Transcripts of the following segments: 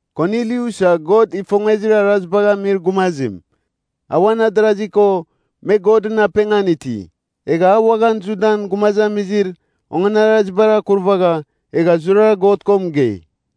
Kornilius a God ifongezir arazibagh amir gumazim, a uan adarazi ko me Godɨn apengan iti. Egha a uaghan Judan gumazamizir onganarazibar akurvagha, egha zurara God ko mɨgei.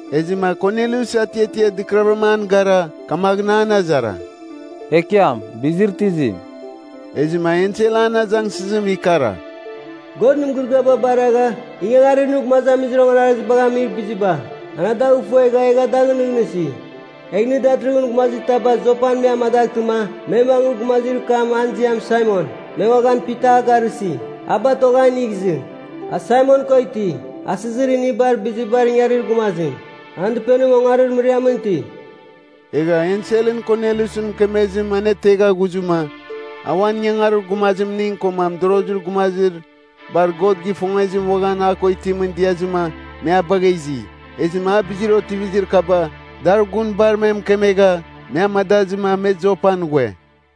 Ezɨma Kornilius atiatia dɨkɨravɨram an gara, kamaghɨn an azara, “Ekiam, bizir itizim?” Ezɨma ensel an azangsɨzim ikara, “God nɨn mɨgɨrɨgɨaba baragha, ingangarir nɨ gumazamizir onganarazibagh amir biziba, an a dagh ifuegha egha dagh nɨghnɨsi. Egh nɨ datɨrɨghɨn gumazitaba Jopan me amadaghtɨma, me mangɨ gumazir kam an ziam Saimon, me uaghan Pita a garɨsi, a batogh a inigh izɨ. A Saimon ko iti, asɨzir inibar bizibar ingarir gumazim. An dɨpenim ongarir mɨriamɨn iti.” Egha enselɨn Kornilius mɨkemezim anetegha ghuzɨma, a uan ingangarir gumazimning koma mɨdorozir gumazir bar God gifongezim uaghan a ko itimɨn diazɨma me a bagha izi. Ezɨma a bizir otivizir kaba, dar gun bar me mɨkemegha, me amadazɨma me Jopan ghue.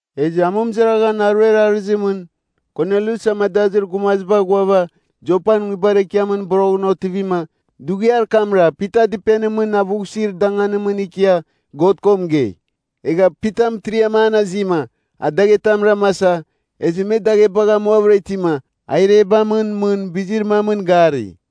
Ezɨ amɨmɨzaraghan aruer arɨzimɨn Kornilius amadazir gumaziba ghuava Jopan nguibar ekiamɨn boroghɨn otivima, dughiar kamra Pita dɨpenimɨn avughsir danganimɨn ikia God ko mɨgei. Egha Pita mɨtiriam an azima, a daghetam ramasa, ezɨ me daghebagh amuavɨra itima, a irebamɨn mɨn bizir mamɨn gari.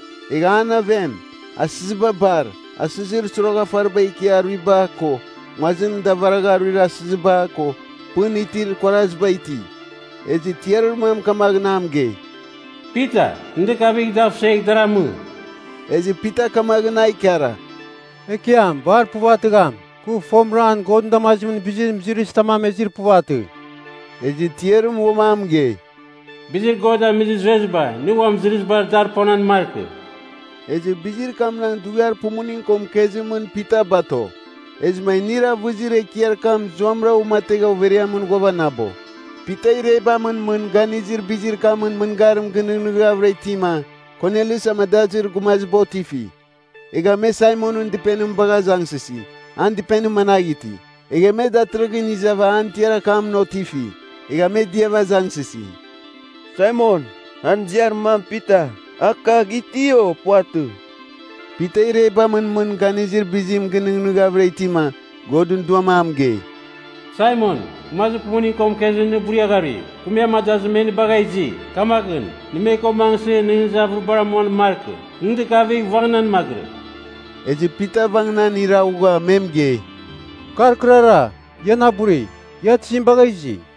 Egha an aven, asɨziba bar—asɨzir soroghafariba ikia aruiba, ko nguazim davaragha aruir asɨziba, ko pɨn itir kuaraziba iti. Ezɨ tiarir mam kamaghɨn a mɨgei, “Pita, nɨ dɨkavigh, dav suegh dar amɨ.” Ezɨ Pita kamaghɨn a ikara “Ekiam bar puvatɨgham! Kɨ fomɨram Godɨn damazimɨn bizir mɨzɨrɨzitam amezir puvatɨ.” Ezɨ tiarim uam a mɨgei, “Bizir God amizir zueziba, nɨ uam mɨzɨrɨzibar dar ponan markɨ.” Ezɨ bizir kamnagh dughiar pumuning ko mɨkezimɨn Pita bato. Ezɨma inir avɨzir ekiar kam zuamɨra uamategha overiamɨn ghuavanabo. Pita irebamɨn mɨn ganizir bizir kamɨn mɨngarim ginɨghnɨghavɨra itima, Kornilius amadazir gumaziba otifi. Egha me Saimonɨn dɨpenim bagha azangsɨsi, an dɨpenim managh iti. Egha me datɨrɨghɨn izava an tiar akamɨn otifi. Egha me diava azangsɨsi, “Saimon, an ziar mam Pita, a kagh iti o puvatɨ?” Pita irebamɨn mɨn ganizir bizim ginɨghnɨghavɨra itima, Godɨn Duam a mɨgei, “Saimon, gumazir pumuning ko mɨkezim nɨ buria gharui. Kɨ me amadazɨma me nɨ bagha izi. Kamaghɨn, nɨ me ko mangɨsɨ nɨghnɨzir avɨribar amuan markɨ. Nɨ dɨkavigh vangɨnan magɨrɨ.” Ezɨ Pita vangɨnan iraghugha me mɨgei, “Kar kɨrara, ia na buri. Ia tizim bagha izi?”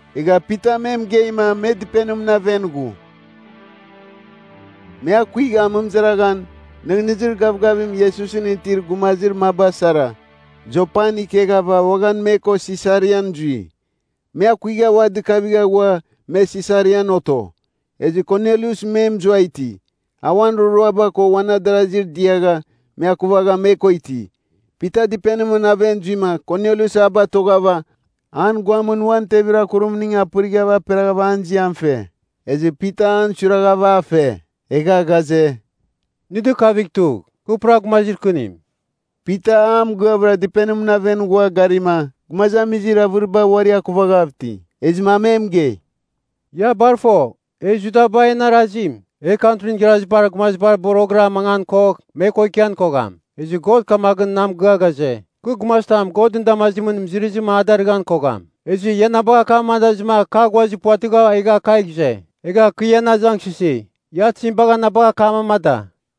Egha Pita me mɨgeima, me dɨpenimɨn aven ghu. Me akuigha amɨmɨzaraghan nɨghnɨzir gavgavim Iesusɨn itir gumazir maba sara, Jopan ikeghava uaghan me ko Sisarian zui. Me akuigha ua dɨkavigha ghua, me Sesarian oto. Ezɨ Kornilius me mɨzua iti. A uan roroaba ko uan adarasi diagha, me akuvagha me ko iti. Pita dɨpenimɨn aven zuima, Kornilius a batoghava, an guamɨn uan tevir akurimning pɨrighav aperaghav an ziam fe. Ezɨ Pita an suiraghav a fe, egha ghaze, “Nɨ dɨkavigh tugh. Kɨ pura gumazir kɨnim.” Pita a mɨgɨavɨra dɨpenimɨn aven ghua garima, gumazamizir avɨriba uari akuvaghav iti. Ezɨma a me mɨgei, “Ia bar fo, e Judaba en arazim. E Kantrin Igharazibar Gumazibar boroghɨra mangan kogh me ko ikian kogham. Ezɨ God kamaghɨn na mɨgɨa ghaze, kɨ gumazitam Godɨn damazimɨn mɨzɨrɨzim a darɨghan kogham. Ezɨ ia na bagha akam amadazɨma kɨ aghuazir puvatɨgha, egha kagh ize. Egha kɨ ian azangsɨsi, ia tizim bagha na bagha akam amada?”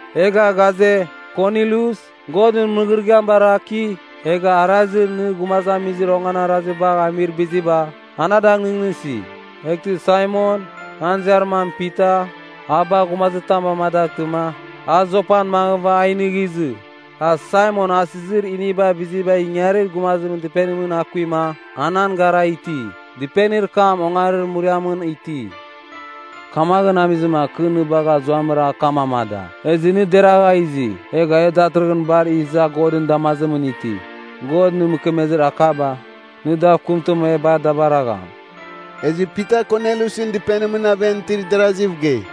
Egha ghaze, ‘Kornilius, God nɨn mɨgɨrɨgɨam baraki, egha arazir nɨ gumazamizir onganarazibagh amir biziba, an adagh nɨghnɨsi. Eghtɨ Saimon, an ziar mam Pita, a bagh gumazitam amadaghtɨma, a Jopan mangɨva a inigh izɨ. A Saimon asɨzir inibar bizibar ingarir gumazimɨn dɨpenimɨn akuima, anan gara iti. Dɨpenir kam ongarir mɨriamɨn iti.’ Kamaghɨn amizima kɨ nɨ bagha zuamɨram akam amada. Ezɨ nɨ deragha izi. Egha e datɨrɨghɨn bar iza Godɨn damazimɨn iti. God nɨ mɨkemezir akaba, nɨ dav kɨmtɨma e bar da baragham.” Ezɨ Pita Korneliusɨn dɨpenimɨn aven itir darasiv gei,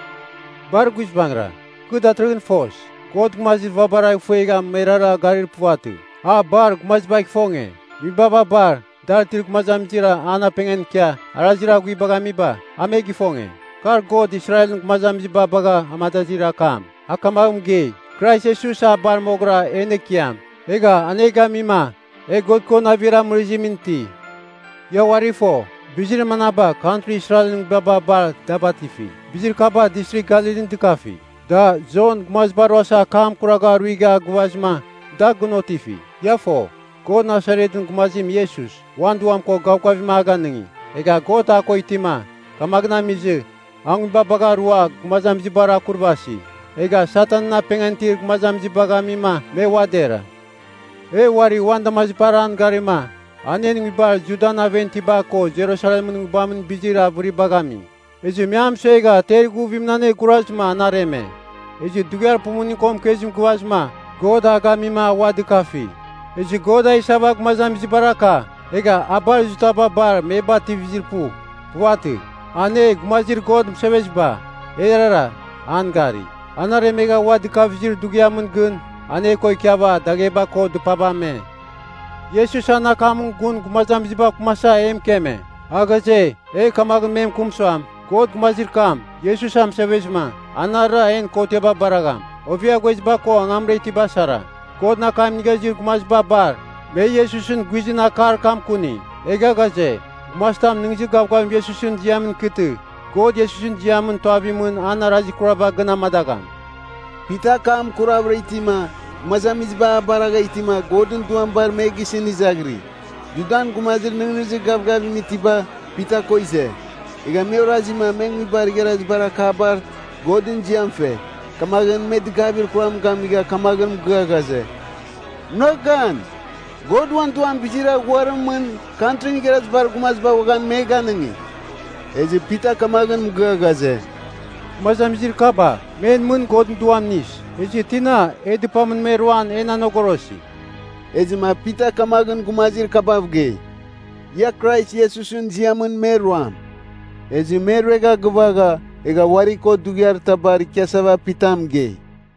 “Bar guizbangɨra, kɨ datɨrɨghɨn fos. God gumazir vabara ifuegha merara garir puvatɨ, a bar gumazibagh ifonge. Nguibaba bar dar itir gumazamizir an apengan ikia, arazir aghuibagh amiba, a me gifonge. Kar God Israelɨn gumazamiziba bagha amadazir akam. A kamaghɨn mɨgei, Krais Iesus a bar moghɨra en Ekiam. Egha an e gamima, e God ko navir amɨrɨzimɨn iti. Ia uari fo, bizir manaba kantri Israelɨn nguibaba bar da batifi. Bizir kaba Distrigh Galilin dɨkafi. Da, Jon gumaziba ruasa akam kuragha aruigha gɨvazɨma, da gɨn otifi. Ia fo, God Nasaretɨn gumazim Iesus, uan Duam ko gavgavim a ganɨngi. Egha God a ko itima, kamaghɨn amizɨ a nguibabagh arua gumazamizibar akurvasi. Egha Satanɨn apengan itir gumazamizibagh ami me ua dera. “E uari uan damazibar an garima, an en nguibar Judan aven itiba ko Jerusalemɨn nguibamɨn bizir avɨribagh ami. Ezɨ me a mɨsuegha ter ighuvimɨn anegurazɨma an areme. Ezɨ dughiar pumuning ko mɨkezim gɨvazɨma God a gamima a ua dɨkafi. Ezɨ God a isava gumazamizibar aka. Egha a bar Judaba bar me bativizir pu. Puvatɨ. An e gumazir God mɨseveziba, erara an gari. An aremegha ua dɨkavizir dughiamɨn gɨn, an e ko ikiava dagheba ko dɨpaba ame. Iesus an akam gun gumazamizibav kɨmasava e mɨkeme. A ghaze, e kamaghɨn me mɨkɨm suam, God gumazir kam, Iesus anemɨsevezɨma, anarɨra en kotiaba baragham, ovia ghueziba ko angamra itiba sara. Godɨn akam inigha izir gumaziba bar, me Iesusɨn guizɨn akar kam kuni. Egha ghaze, gumazitam nɨghnɨzir gavgavim Iesusɨn ziamɨn ikɨtɨ, God Iesusɨn ziamɨn tuavimɨn an arazir kuraba gɨn amadagham.” Pita akam kuravɨra itima, gumazamiziba a baragha itima, Godɨn Duam bar me gisɨn izaghiri. Judan gumazir nɨghnɨzir gavgavim itiba, Pita ko ize. Egha me orazima me nguibar igharazibar akabar Godɨn ziam fe. Kamaghɨn me dɨgavir kuram gamigha kamaghɨn mɨgɨa ghaze, “Munagh gan! God uan Duam bizir aghuarimɨn mɨn Kantrin Igharazibar Gumaziba uaghan me ganɨngi.” Ezɨ Pita kamaghɨn mɨgɨa ghaze, “Gumazamizir kaba, me en mɨn Godɨn Duam inis. Ezɨ tina, e dɨpamɨn me ruam en anegorosi?” Ezɨma Pita kamaghɨn gumazir kabav gei, “Ia Krais Iesusɨn ziamɨn me ruam.” Ezɨ me ruegha gɨvagha, egha uari ko dughiar tabar ikiasava Pita mɨgei.